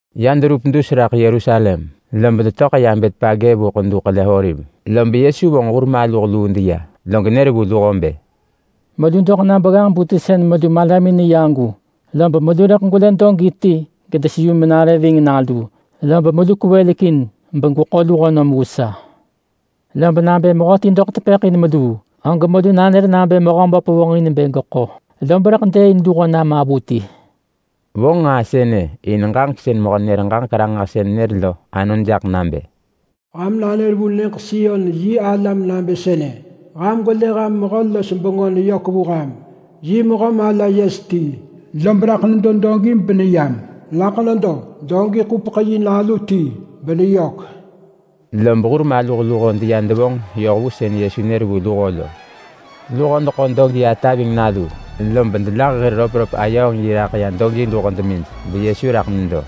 Ya deverup dus raḳ Yerusalem, lob detöḳ ya Betpage vu Ḳedu Ḳele-oliv. Lob Yesu vonġ hur maluh luu deya, log nër vu luho bë, “Melu doḳ na begganġ-bu ti sën melu malamin neya agu, lob pevis bemelu rëḳ gwelë dogi ti gedeseyu menare genalu nare ving. Lob melu kwevelekin begweḳo luho nom vu sa. Lob nabë mehöti nanër ġaġek jaḳ meluu, og melu nanër nabë Mehöböp bë jaḳ mena. Lob rëḳ gevonġ luho nam pevis.” Vonġ nġaa sënë in ġaġek sën mehö-nenër-ġaġek-ranġahsën nër lo anon jaḳ nabë: “Ham nanër vu nyëġ Sion yi alam nabë sënë: ‘Ham gwelë ham mehö-los-bengö neyök vu ham. Yi mehö mala yes ti, lob raḳ nedo dogi beneyam. Raḳ nedo dogi-ḳupeḳ-yi nalu ti beneyök.’” Lob hur maluh luho ya devonġ yoh vu sën Yesu nër vu luho lo. Luho deḳo dogi ata ving nalu, lob delah hir röpröp ayööng yi raḳ ya dogi luho demij, beYesu raḳ nedo.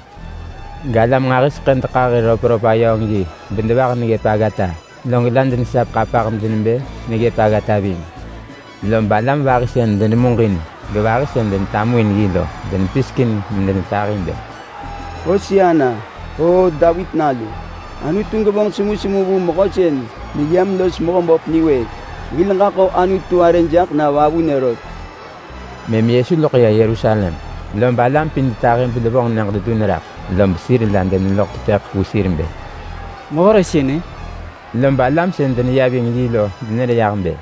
Galam nġahiseḳë dekah hir röpröp ayööng yi bedevah neggëp aggata. Log la denesap ḳapah medenebë neggëp aggata ving. Lob alam vahi sën denemuġin gevahi sën denetamuin yi lo denepisekin medenetahi bë: “Hosana, Oo Davit Nalu! Anutu gevonġ semusemu vu mehö sën neyam los Mehöböp niwëëk! Hil ġaḳo Anutu arë jaḳ na vavunë rot!” Mëm Yesu loḳ ya Yerusalem, lob alam pin detahi bedevonġ nyëġ dedun raḳ log sir vahi deneloḳ tepëḳ vu sir bë, “Mehö re sënë?” Lob alam sën deneya ving yi lo denër yah bë,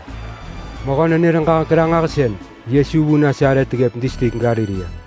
“Mehö-nenër-ġaġek-ranġahsën Yesu vu Nasaret ggëp distrik Galilea!”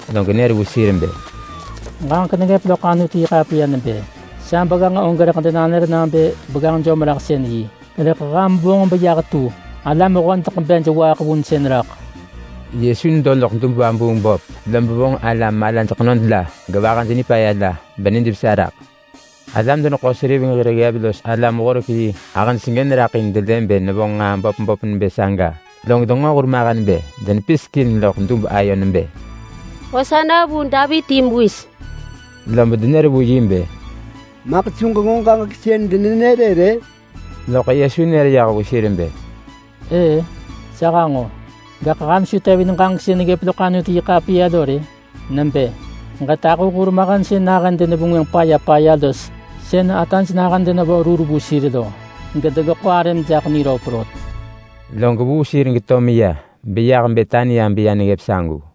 Log nër vu sir bë, “Ġaġek neggëp loḳ Anutu-yi-ḳapiya nebë, ‘Sa begganġ og rëḳ denanër nabë begganġ jom-raḳsën-yi. Rëḳ ham vonġ beyah tu alam hodeḳ bej waaḳ vunsën raḳ.’” Yesu nedo loḳ dub-vabuung-böp lob vonġ alam malaj ḳenod la gevahaj nipaya la, benijvesa raḳ. Alam-deneḳo-seriveng hir ggev los alam-horek-yi ahëj sengën raḳ in delë bë nevonġ nġaa böp böp nebë saga, log denġo hurmahen bë denepisekin loḳ dub ayo nebë, “Hosana vu Davit yi Mewis!” lob denër vu yi bë, “Maḳ su ġenġo ġaġek sën denenër-ë rë?” Loḳ Yesu nër yah vu sir bë, “Ëë-ë, sa hanġo! Gaḳ ham su tevin ġaġek sën neggëp loḳ Anutu-yi-ḳapiya lo rë? Nebë: ‘Ġetahu hurmahen sën nahën denevengwënġ paya paya los sën ataj nahën denevo rur vu sir lo, gedegeḳo arëm jaḳ niröp anon.’” Log vuu sir geto meya beyah Betania beya neggëp sagu.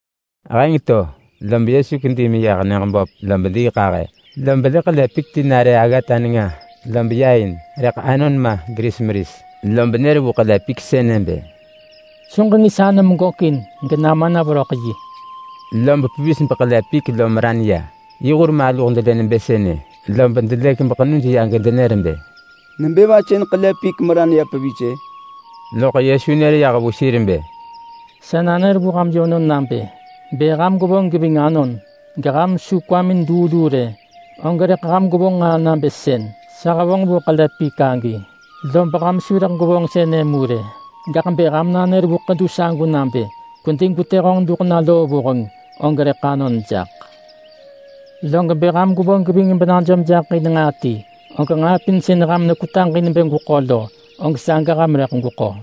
Heng to, lob Yesu kedi meyah nyëġ böp lob diiḳahë, lob lë ḳele pik ti nare loḳ aggata nenga beya in, rëḳ anon ma geris meris. Lob nër vu ḳele pik sënë bë, “Su ġengis anom gökin genama na veröḳ yi!” Lob pevis beḳele pik lo meran ya. Yi hur maluh delë nebë sënë, lob delëk beḳenuj ya gedenër bë, “Nebë va sën ḳele pik meran ya pevis-ë?” Loḳ Yesu nër yah vu sir bë, “Sa nanër vu ham yönon nabë: Bë ham gwevonġ geving anon, geham su kwamin luu luu rë, og rëḳ ham gwevonġ nġaa nabë sën sa hevonġ vu ḳele pik agi. Lob ham su rëḳ gwevonġ sënë mu rë. Gaḳ bë ham nanër vu ḳedu sagu nabë, ‘Kwedi gwetë honġ duḳ na loo vuheng!’ og rëḳ anon jaḳ. Log bë ham gwevonġ geving benajom jaḳ in nġaa ti, og nġaa pin sën ham nekwetaġ in bë gweḳo lo, og saga ham rëḳ gweko.”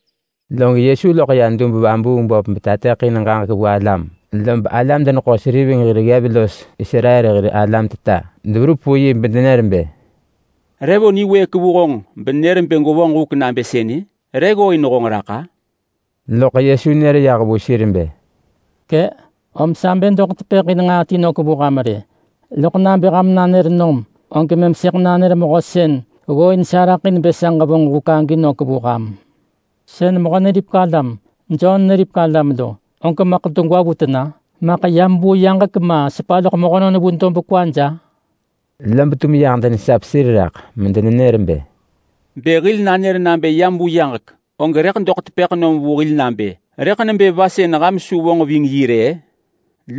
Log Yesu loḳ ya dub-vabuung-böp betateḳin ġaġek vu alam. Lob alam-deneḳo-seriveng hir ggev los Israel hir alam teta deverup vu yi bedenër bë, “Re vo niwëëk vu honġ benër bë gwevonġ huk nabë sënë? Re ggooin honġ raḳ-a?” Loḳ Yesu nër yah vu sir bë, “Kë”, om sa bë doḳ tepëḳ in ġaġek ti nök vu ham rë, loḳ nabë ham nanër nom, og mëm sëḳ nanër mehö sën ggooin sa raḳ in bë sa ġevonġ huk agi nök vu ham. Sën Mehö-neripek-alam Jon neripek alam lo, og maḳ degwa vu tena? Maḳ yam vu yaġek ma sepa loḳ mehönon vu dob kwaj?” Lob tum yah denesap sir raḳ medenenër bë, “Bë hil nanër nabë yam vu yaġek, og rëḳ doḳ tepëḳ nom vu hil nabë, ‘Rëḳ nebë va sën ham su vonġ ving yi rë-ë?’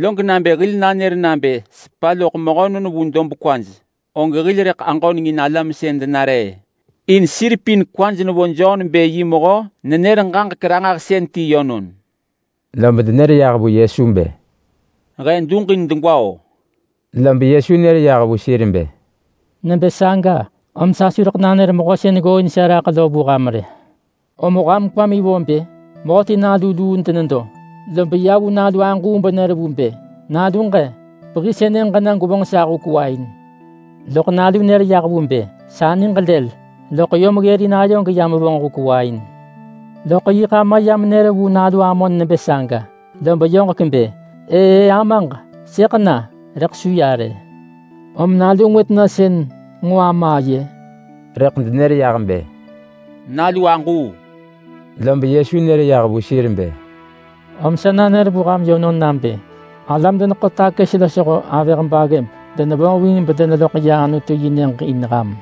Log nabë hil nanër nabë sepa loḳ mehönon vu dob kwaj, og hil rëḳ aġönengin alam sën denare-ë. In sir pin kwaj nevo Jon bë yi mehö-nenër-ġaġek-ranġahsën ti yönon.” Lob denër yah vu Yesu bë, “He duġin degwa-o!” Lob Yesu nër yah vu sir bë, “Nebë saga, om sa su rëḳ nanër mehö sën ggooin sa raḳ lo vu ham rë!” “Rëḳ ham kwamin vo bë? Mehöti nalu luu denedo, lob ya vu nalu aġuu benër vu bë, ‘Naluġ-e, pehi sënë ġena gwevonġ sa huk wain!’ Loḳ nalu nër yah vu bë, ‘Sa niġ lël!’ Loḳ yom ggërin ayo geya mevonġ huk wain. Log yiḳ ama ya menër vu nalu amon nebë saga, lob yoġek bë ‘Ëë, amaġ! Sëḳ na!’ Rëḳ su ya rë. Lom nalu ngwë tena sën nġo ama aye?” Rëḳ denër yah bë, “Nalu aġuu!” Lob Yesu nër yah vu sir bë, “Om sa nanër vu ham yönon nabë alam-deneḳo-takës losho avëh baggëb denevonġ ving bedeneloḳ ya Anutu yi Nyëġ in ham.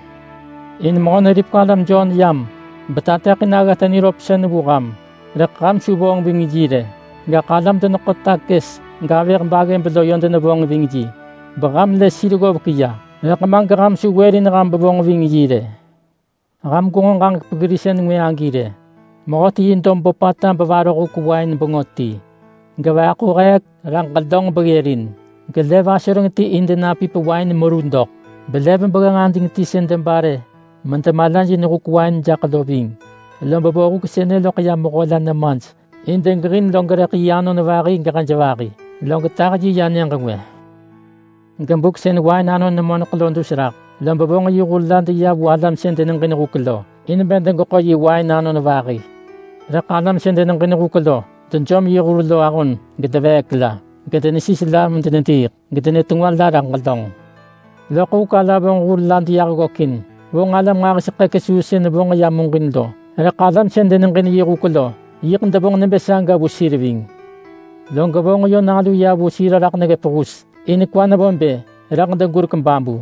In Mehö-neripek-alam Jon yam betateḳin aggata niröpsën vu ham, rëḳ ham su vonġ ving yi rë. Gaḳ alam-deneḳo-takës gavëh baggëb lo yö denevonġ ving yi. Beham lë sir ggovek ya, rëḳ ma geham su wërin ham bevonġ ving yi rë.” “Ham gwenġo ġaġek peggirinsën ngwë agi rë! Mehöti los yi dob böpata bevaroh huk wain bengö ti. Gejegelin ġelönġ netu heek beggërin, gesemu nyëġ gelev asoreng ti in denapip wain anon doḳ, belev begganġ ading ti sën debare jaḳ medemalajin huk wain lo ving. Lob vo huk sënë loḳ ya mehö la nemaj in bë degeġin ganon vahi natu yi yi gevahi natu hej, log tah yi ya nyëġ ngwë. Gebuk sën wain anon nemoneḳ lo dus raḳ, lob vonġ yi hur la deya vu alam sën deneġin huk lo in bë degeḳo yi wain anon vahi. Rëḳ alam sën deneġin huk lo dejom yi hur lo ahon bedeneveek la, gedenesis la medenediiḳ, gedenetengwa la raḳ ġelönġ. Loḳ huk ala vonġ hur la deyah ggökin. Vonġ alam nġahiseḳë kesuu sën vonġ ya muġin lo, rëḳ alam sën deneġin yi huk lo yiḳ devonġ nebë saga vu sir ving. Log vonġ nalu ya vu sir raḳ neggëp hus. In kwa nevo bë, ‘Rëḳ degurek babu!’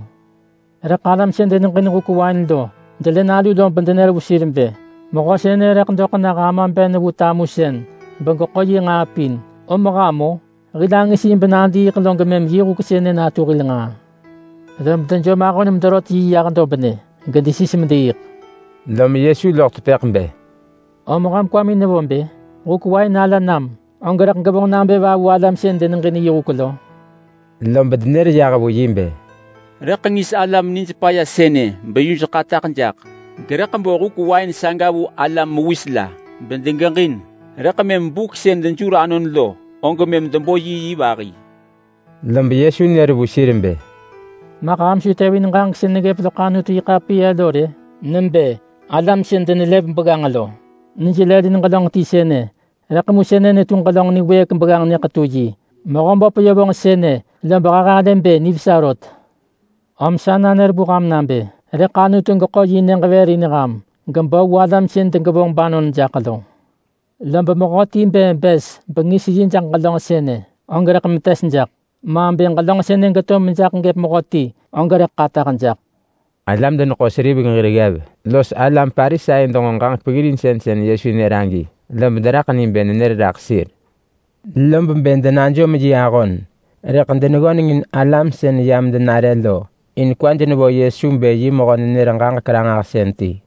Rëḳ alam sën deneġin huk wain lo delë nalu lob yö denër vu sir bë, ‘Mehö sënë rëḳ doḳ nah ama ben vu tamusën begeḳo yi nġaa pin. Om ham-o! Hil angis yi benadiiḳ log mëm yi huk sënë natu hil nġaa!’ Lob dejom ahon mederot yi yah dobnë, gedesis mediiḳ.” Lom Yesu loḳ tepëḳ bë, “Om ham kwamin nevo bë? Nahub rëḳ huk wain ala nam, og rëḳ gevonġ nabë va vu alam sën deneġin yi huk lo?” Lob denër yah vu yi bë, “Rëḳ ngis alam nij paya sënë beyuj ḳataḳ jaḳ. Gerëḳ bo huk wain saga vu alam mewis la bedegeġin, rëḳ mëm buk sën dejur anon lo, og mëm debo vahi vu yi!” Lob Yesu nër vu sir bë, “Maḳ ham su tevin ġaġek sën neggëp loḳ Anutu-yi-ḳapiya lo rë? Nebë: ‘Alam sën denelev begganġ lo, nij lëlin ġelönġ ti sënë. Rëḳ mu sënë netu ġelönġ niwëëk begganġ nyëḳetu-yi. Mehöböp vonġ sënë lob he halë bë nivesa rot.’ Om sa nanër vu ham nabë rëḳ Anutu geḳo yi Nyëġ vër in ham, gebo vu alam sën degevonġ banon jaḳ lo. [Lob mehöti bë bës bengis yi jaḳ ġelönġ sënë, og rëḳ metes jaḳ. Ma bë ġelönġ sënë geto mejaḳ gëp mehöti, og rëḳ ḳataḳ jaḳ.]” Alam-deneḳo-seriveng hir ggev los alam Parisai denġo ġaġek peggirinsën sën Yesu nër agi, lob deraḳ ni bë nenër raḳ sir. Lob bë denajom yi ahon, rëḳ deneggönengin alam sën yam denare lo in kwaj nevo Yesu bë yi mehö-nenër-ġaġek-ranġahsën ti.